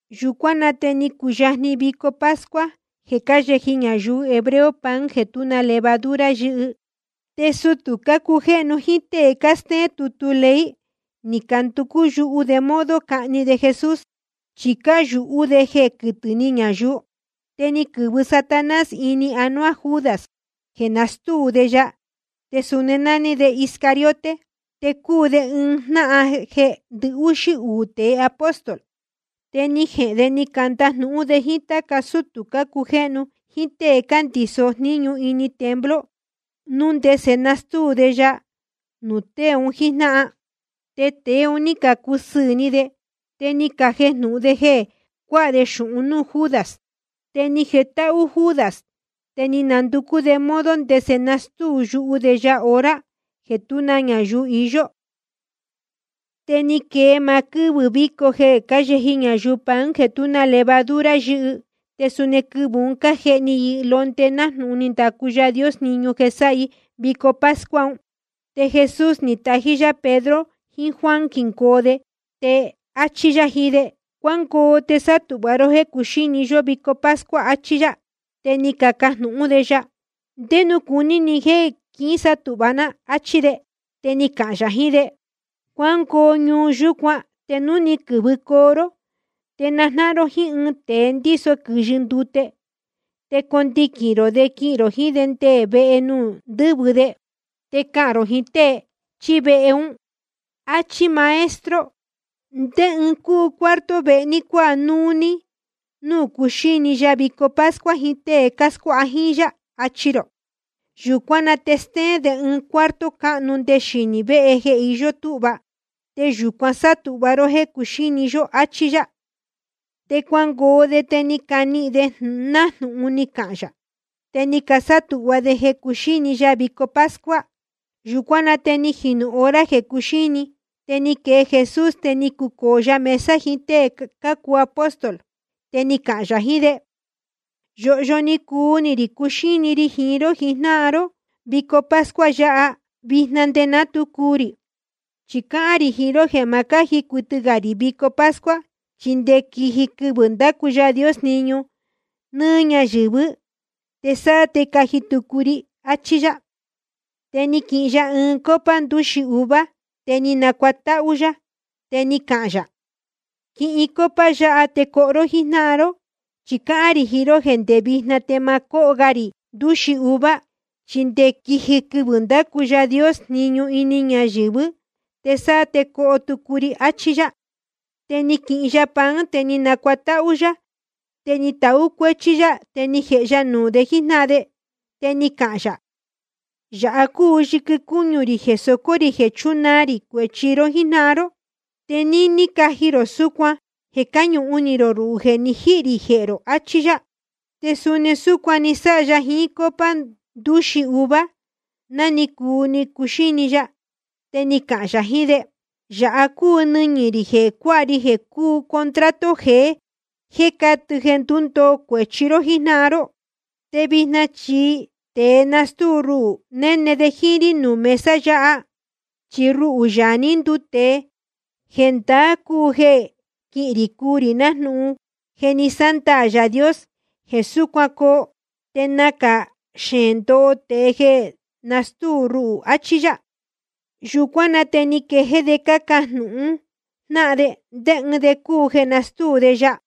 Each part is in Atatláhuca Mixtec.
Yūcuán na te ni cuyajni vico pascua jeē cáyeji ñayuu hebreo pan jeē tú na levadura yɨ́hɨ. Te sutū cácujéhnu jíín tée cástéén tutu ley, ni canducú yuhu de modo cahni de Jesús, chi cáyūhú de jeē quɨtɨ̄ ni ñayuu. Te ni quɨ̄vɨ Satanás ini anuá Judas jeē nastúu de ya. Te suni nání de Iscariote, te cúu de ɨɨn jnáhan jeē ndɨhúxí uū tēe apóstol. Te ni jehēn de ni candajnūhún de jíín táca sútū cácujéhnu jíín tée cándiso jníñu ini templo, núu ndese nastúu de ya nuū tée un jíjnáhan. Te tēe un ní cacusɨɨ̄ ni de, te ni cajejnūhun de jeē cuáha de xūhun núū Judas. Te ni jetáhú Judas, te ni nducú de modo ndese nastúu yuhu de ya hora jeē tú na ñayuu iyó. Te ni quee maá quɨ́vɨ̄ víco jeē cáyeji ñayuu pan jeē tú na levadura yɨ́hɨ, te suni quɨvɨ̄ un cájehni i londe nájnūhun ni ndacu Yaā Dios jniñu jeē sáha i vico pascua un. Te Jesús ni tají yá Pedro jiín Juan quingoo de, te áchí yá jiín de: Cuángoo te sátūhva ró jéē cuxíni yó vico pascua, achí yá. Te ni cacajnūhún de ya: ¿Ndé nuū cuní ni jéē quísátūhva ná? áchí de. Te ni cahān yā jiín de: Cuángoo ñuu yūcuán, te núu ni quɨ̄vɨcoo ró te najnáhan ró jíín ɨɨn tēe ndíso quɨ̄yɨ ndute. Te condiquīn rō de quihīn rō jiín de nde vehe nuū ndɨ́vɨ de. Te cahān rō jiín tée chíí vehe ún: Achí máá Maestro: ¿Ndé ɨɨn cúu cuarto vehe ní cuāha núú ní núū cuxíni ya vico pascua jiín tée cáscuáha jíín yá, achi rō. Yūcuán na te stéén de ɨɨn cuarto cáhnu nde xinī véhe jeē je íyó túhva, te yūcuan sátūhva ró jéē cuxíni yó, áchí yá. Te cuangoo de, te ni canihīn de nájnūhun ni cahān yā. Te ni casátūhva de jeē cuxíni ya vico pascua. Yūcuán na te ni jinū hora jeē cuxíni, te ni quee Jesús, te ni cucōo ya mesa jiín tée cácuu apóstol. Te ni cahān yā jiín de: Yōhyo ni cuu ni rī cuxíni ri jiín ró jijnáhan ró vico pascua yáha, vijna nde ná tu cuu rī. Chi cáhán rī jiín ró jeē ma cáji cuɨtɨ gā rī vico pascua, chi nde quiji quɨvɨ̄ ndacu Yaā Dios jniñu nɨ́ɨ́ ñayɨ̄vɨ́, te sáá te caji tucu ri, achí yá. Te ni quihin ya ɨɨn copa ndūxi uva, te ni nacuatáhú yá, te ni cahān yā: Quihin copa yáha, te coho ró jíín jnáhan ró. Chi cáhán rī jiín ró jeē ndé vijna te ma cóho ga rī ndūxi uva, chi nde quiji quɨvɨ̄ ndacu Yaā Dios jniñu nɨ́ɨ́ ñayɨ̄vɨ́, te sáá te coho tucu ri. Achí yá. Te ni quihin ya pan, te ni nacuatáhú yá, te ni tahú cuéchí yá, te ni jēhe ya nuū de jíjnáhan de. Te ni cahān yā: Yāha cúu yɨquɨ cúñu rī jeē socō rī jeē chunaa rī cuēchi ró jíjnáhan ró. Te níní caji rō súcuan jeē cáñuhun ni rō ruhū jeē ni jíhī rī jehē rō. Achí yá. Te suni súcuan ni sáha ya jiín copa ndūxi uva, ná ni cuu ni cuxíni ya. Te ni cahān yā jiín de: Yāha cúu nɨñɨ̄ rī jeē cuáha ri jeē cúu contrato jeé, te catɨ jeē ndundoo cuēchi ró jíjnáhan ró. ’Te vijna chi tēe nastúu ruhū, néne de jíín rí nuū mesa yáha. Chi ruhū, Yaā ní nduu tēe, jendaá cúu jeē quihín rī cuu rī nájnūhun je ni sándaā Yaā Dios jeē súcuan coo. Te nacā xeēn ndoho tēe jeē nastúu ruhū, achí yá. Yūcuán na te ni caquejéé de cácajnūhun jnáhan de ndé ɨɨn de cúu jeē nastúu de ya.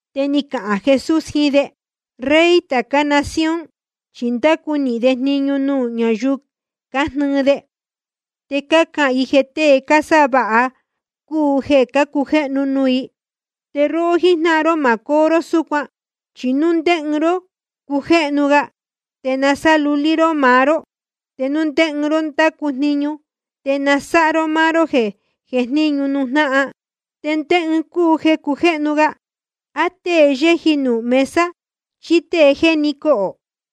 Te ni cahān Jesús jiín de: Rey tācá nación chi cándacu nīhin de jniñu nuū ñáyuu cájnɨɨ de, te cácahān i jeē tée cásáha vāha cúu jeē cácujéhnu nuū i. Te róhó jíjnáhan ró, ma cóo ró súcuan. Chi núu ndé ɨɨn ró cújéhnu ga, te sa nasáha lulí ró maá ró. Te núu ndé ɨɨn ró ndácu jniñu, te sa nasáha ró máá ró tēe jéjníñu nuū jnáhan. ¿Te ndé ɨɨn cúu jeē cujéhnu ga, á tée yéji nuū mesa, chí tée jéni cohō?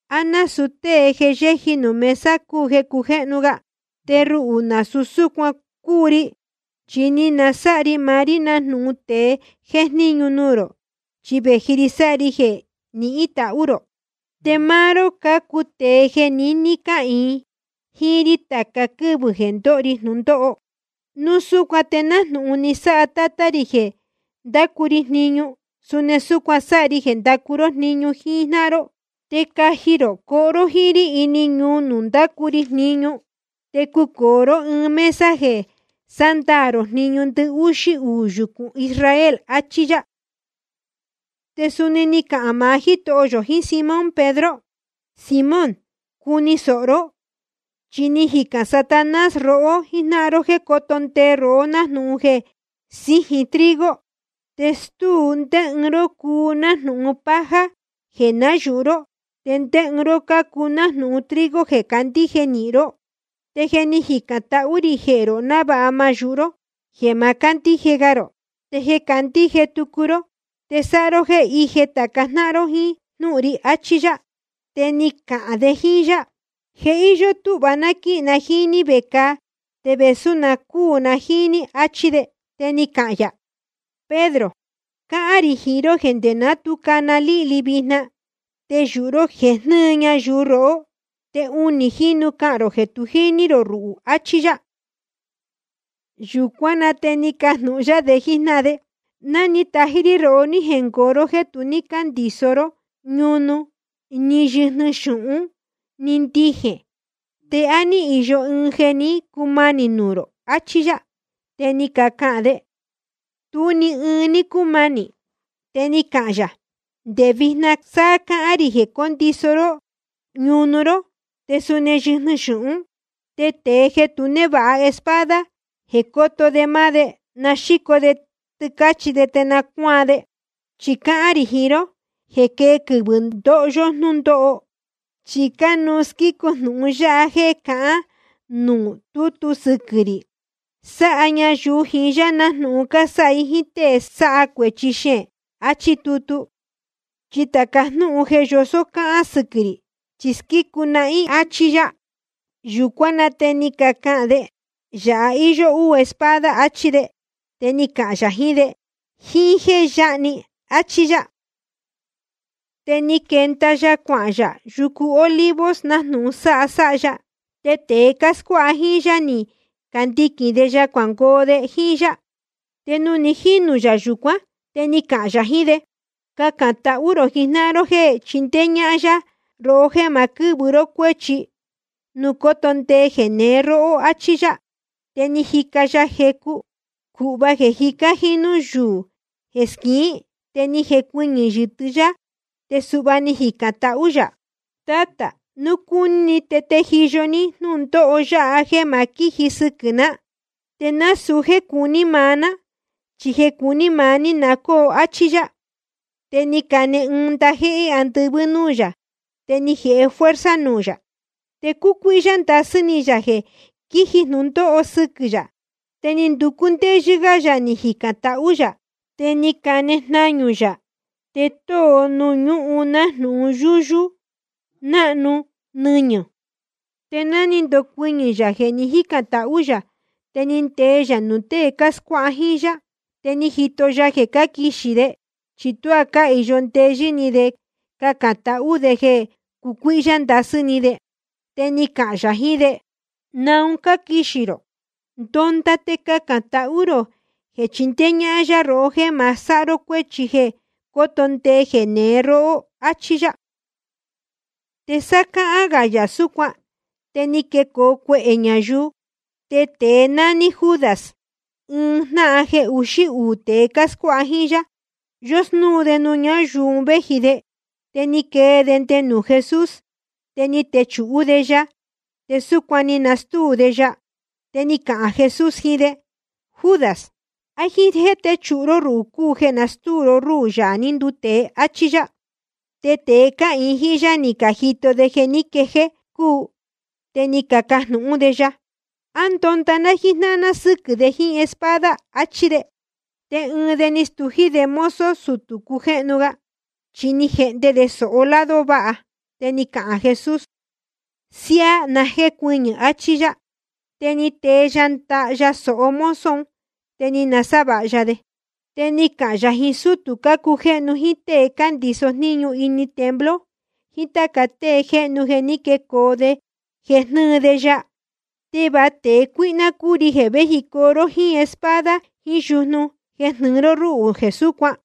¿A násūu tée jeē yéji nuū mesa cúu jeē cujéhnu ga? Te ruhū nasūu súcuan cúu ri, chi ni nasáha ri maá rí nájnūhun tēe jéjníñu nuū rō, chi vēji ri sáha ri jeē nihín tahú rō. ’Te máá ró cácuu tēe jeē niní cáhīin jíín rí tāca quɨ́vɨ̄ jeē ndóho ri jnūndóho. Núu súcuan te nájnūhun ni sáha Tátá rī jeē ndácu ri jniñu, suni súcuan sáha ri jeē ndacu ró jniñu jíjnáhan ró. Te caji rō coho ró jíín rí ini ñuu nuū ndacu ri jniñu. Te cucōo ró ɨɨn ɨɨn mesa jeē sándaā rō jniñu ndɨhúxí uū yucūn Israel. Achí yá. Te suni ni cahān maá Jítoho yō jiín Simón Pedro: Simón, cuni sōho ró, chi ni jicān Satanás rohó jíjnáhan ró jéē coto ndee rohó nájnūhun jeē síjin trigo, te stúu ndé ɨɨn ró cácuu nájnūhun paja jeē nayūhu ró, te ndé ɨɨn ró cácuu nájnūhun trigo jeē candíje nīhin ró. Te ni jicān tahú rī jehē rō návāha ma náyūhu ró jeē ma cándíje ga rō. Te jeē nácandíje tucu ró, te sáha ró jéē íje tāca jnáhan ró jíín jnúhun ri. Achí yá. Te ni cahān de jíín yá: Je íyó túhva ná quíhīn na jíín ní vecāa te vēsú na cuu na jíín ní, achí de. Te ni cahān yā: Pedro, cáhán rī jiín ró jeē nde ná tu cana líhli vijna, te yūhu ró jeē jnɨɨ ñayuu rohó, te unī jínu cahān rō jeē tu jíní rō ruhū, achí yá. Yūcuán na te ni cajnūhun yá de jíjnáhan de: Ná ni tají rí rohó ní jengoo ró jéē tu ní cóndiso ró ñunu ni yɨjnɨ xūhún ni ndijēn, ¿te á ní īyo ɨɨn jeē ní cumanī nuū rō? Achí yá. Te ni cacahān de: Tú ni ɨɨn ní cúmanī. Te ni cahān yā: Nde vijna sa cáhán rī jeē cóndiso ró ñunu ró, te suni yɨjnɨ xūhún. Te tēe jeē tu névāha espada jeē coto de máá de, na xíco de tɨcāchí de te na cuáan de. Chi cáhán rī jiín ró jeē quee quɨvɨ̄ ndoho yó jnúndóho, chi cánuú squícu jnūhun yáha jéē cahán nuū tútu sɨquɨ̄ rī: Sáha ñayuu jiín yá nájnūhun cásáha i jíín tée sáha cuēchi xeēn, áchí tutu. Chi tāca jnúhun un jéē yosó cáhán sɨquɨ̄ rī, chi squícu nahín, áchí yá. Yūcuán na te ni cacahān de: Yāha íyó úū espada, achí de. Te ni cahān yā jiín de: Jíín jéē yáha‑ni, áchí yá. Te ni quenda ya cuahān yā yucu Olivos nájnūhun sáha sáha ya. Te tēe cáscuáha jíín yá ni candiquīn de ya cuangoo de jíín yá. Te nuū ni jínū yā yūcuán, te ni cahān yā jiín de: Cacān tahú rō jijnáhan ró jéē chindéé ñáhán yá rohó jéē ma sáha ró cuéchi núu coto ndee jeneé róhó, achí yá. Te ni jica ya jecu, cūhva jeē jicá jínú yuū jeē squiín. Te ni jecuɨñɨ̄ yɨtɨ́ yá, te suhva ni jicān tahú yā: Tátā, núu cúní ni te tejiyo ní jnúndóho yáha jéē ma quíji sɨquɨ̄ ná. Te nasūu jéē cuní maá ná, chi jeē cuní maá ní na cóo, áchí yá. Te ni cane ɨɨn ndajéhé andɨvɨ́ núū yā, te ni jēhe fuerza nuū yā. Te cúcuíhyá ndasɨ́ ni yā jeē quiji jnūndóho sɨquɨ̄ yā, te ni nducú ndéyɨ́ gá yā ni jicān tahú yā. Te ni cane jnañū yā, te tóo nuū ñúhun nájnūhun yúyú náhnu nɨñɨ̄. Te ná ni ndocuɨñɨ̄ yā jeē ni jícān tahú yā, te ni ndee yā nuū tée cáscuáha jíín yá. Te ni jito ya jeē cáquixī de, chi tuá cáhīyo ndeyɨ́ ni de cacān tahú de jeē cácucuíhyá ndasɨ́ ni de. Te ni cahān yā jiín de: ¿Naun cáquixī rō? Ndonda te cacān tahú rō jeē chindéé ñáhán yá rohó jéē ma sáha ró cuéchi jeē cóto ndee jeneé róhó. Achí yá. Te sá cáhán gā yā súcuan, te ni quecoo cuehē ñayuu. Te tēe nání Judas, ɨɨn jnáhan jeē uxí uū tēe scuáha jíín yá, yósnúu de nuū ñáyuu un véji de. Te ni quee de nde nuū Jesús, te ni techūhú de ya, te súcuan ni nastúu de ya. Te ni cahān Jesús jiín de: Judas, ¿á jíín jéē téchūhu ró ruhū cúu jeē nastúu ró rúhū, Yaā ní nduu tēe? Achí yá. Te tēe cáhīin jíín yá, ni cajito de jeē ní quejéé cúu, te ni cacajnūhún de ya: ¿A ndonda ná jíjnáhan ná sɨ́quɨ̄ de jíín espada? áchí de. Te ɨɨn de ni stují de mozo sutū cujéhnu ga, chi ni jehnde de sōho lado váha. Te ni cahān Jesús: Siáá, na jécuɨñɨ̄, achí yá. Te ni tee ya ndaha ya sōho mozo un, te ni nasávāha ya de. Te ni cahān yā jiín sútū cácujéhnu jíín tée cándiso jníñu ini templo jiín táca tée jéhnu jeē ní quecoo de jeē jnɨ́ɨ de ya: ¿Te va tēe cuíhná cúu ri jeē véjicoo ró jíín espada jiín yujnu jeē jnɨɨ ró rúhū jeē súcuan?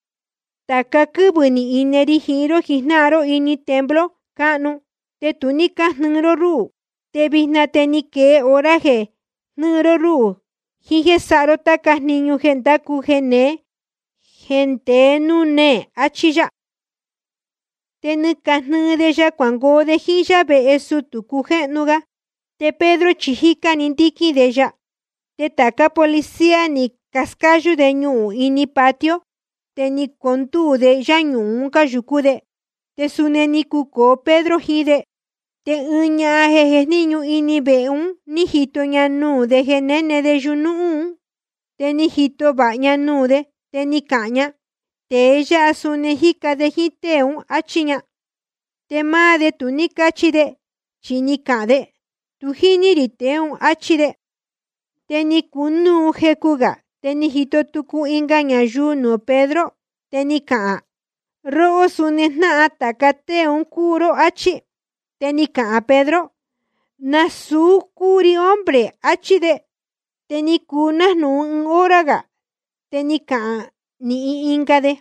Tāca quɨ́vɨ̄ ni ine ri jiín ró jijnáhan ró ini templo cáhnu, te tu ní cájnɨɨ ró rúhū. Te vijna te ni quee hora jeē jnɨɨ ró rúhū jiín jéē sáha ró táca jniñu jeē ndácu jeneé jéē ndeé núū néē. Achí yá. Te ni cajnɨɨ de ya cuangoo de jíín yá vehe sutū cujéhnu ga. Te Pedro chi jícá‑ni ndíquín de ya. Te tācá policía ni cascáyú de ñuhūn ini patio, te ni condúu de yuñúhún un cáyūcú de. Te suni ni cucōo Pedro jiín de. Te ɨɨn ñahan jéjníñu ini vehe un, ní jito ña nuū de jeē néne de yuñúhún. Te ni jito vāha ña nuū de, te ni cahān ña: Tēe yáha suni ni jica de jíín tée ún, áchí ña. Te máá de tu ní cáchi de, chi ni cahān de: Tu jíní rī tēe ún, áchí de. Te ni cunúu jecu gā, te ni jito tucu ɨnga ñayuu nuū Pedro, te ni cahān: Róhó, suni jnáhan tāca tée un cúu ró, áchí. Te ni cahān Pedro: Nasūu cúu ri, hombre, achí de. Te ni cuu nájnūhun ɨɨn hora gā, te ni cahān nīhin ɨnga de: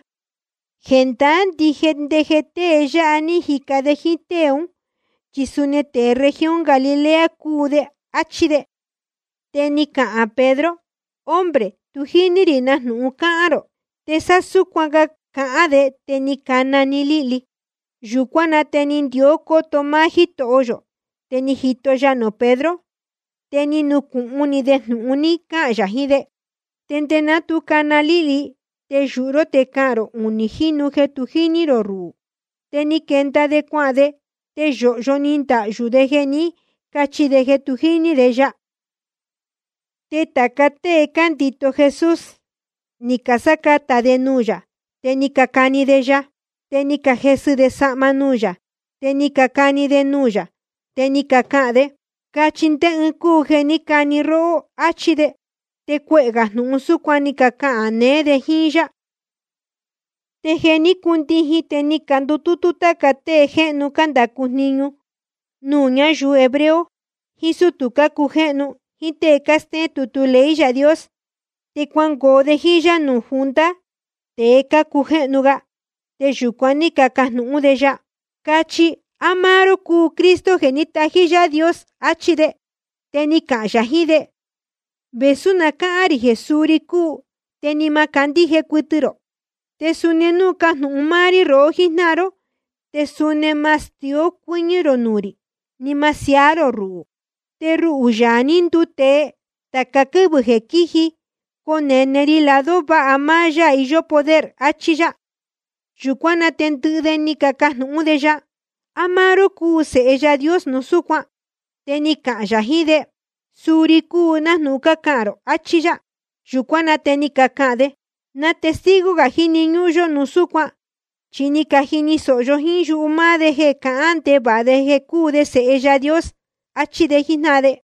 Jendaá ndije jeē tée yáha ní jica de jíín tée ún, chi suni tēe región Galilea cúu de, áchí de. Te ni cahān Pedro: Hombre, tu jíní rī na jnūhun cáhán rō. Te sá súcuan cáhán gā de, te ni cana‑ni líhli. Yūcuán na te ni ndió cóto máá Jítoho yō, te ni jito ya nuū Pedro. Te ni nucūhun ni de jnūhun ni cahān yā jiín de: Nde ná tu cana líhli, te yūhu ró te cahān rō unī jínu jeē tu jíní rō ruhū. Te ni quenda de cuahān de, te yōhyo ni ndahyū de jeē ní cachi de jeē tu jíní de ya. Te tāca tée cándito Jesús, ni casácatā de nuū yā, te ni cacani de ya. Te ni cajesɨ de sahma nuū yā, te ni cacani de nuū yā, te ni cacahān de: Cachi ndé ɨɨn cúu jeē ní cani róhó, áchí de. Te cuehē gā jnūhun súcuan ni cacahān neé de jíín yá. Te jeē ní cundijin, te ni candutútú táca tée jéhnu cándacu jniñu nuū ñayuu hebreo, jiín sútū cácujéhnu, jíín tée cástéén tutu ley Yaā Dios. Te cuangoo de jíín yá nuū junta tēe cácujéhnu ga, te yūcuan ní cacajnūhún de ya: Cachi, ¿á máá ró cúu Cristo jeē ní tají Yaā Dios? Achí de. Te ni cahān yā jiín de: Vēsú na cáhán rī jeē suu ri cúu, te ni ma candíje cuɨtɨ rō. Te suni núu cajnūhun máá rí rohó jíjnáhan ró, te suni ma stió cuɨ́ñɨ́ rō nuū rī, ni ma siaá rō ruhū. Te ruhū, Yaā ní nduu tēe, tāca quɨ́vɨ jeē quíji conene ri lado váha máá Yaā iyó poder, achí yá. Yūcuán na te ndɨhɨ de ni cacajnūhún de ya: ¿A máá ró cúu Sēhe Yaā Dios núu súcuan? Te ni cahān yā jiín de: Suu ri cúu, nájnūhun cácahān rō, achí yá. Yūcuán na te ni cacahān de: ¿Na testigo gā jíni ñúhún yó núu súcuan? Chi ni cajini sōho yó jíín yuhu máá de jeē cahán ndevāha de jeē cúu de Sēhe Yaā Dios. Achí de jíjnáhan de.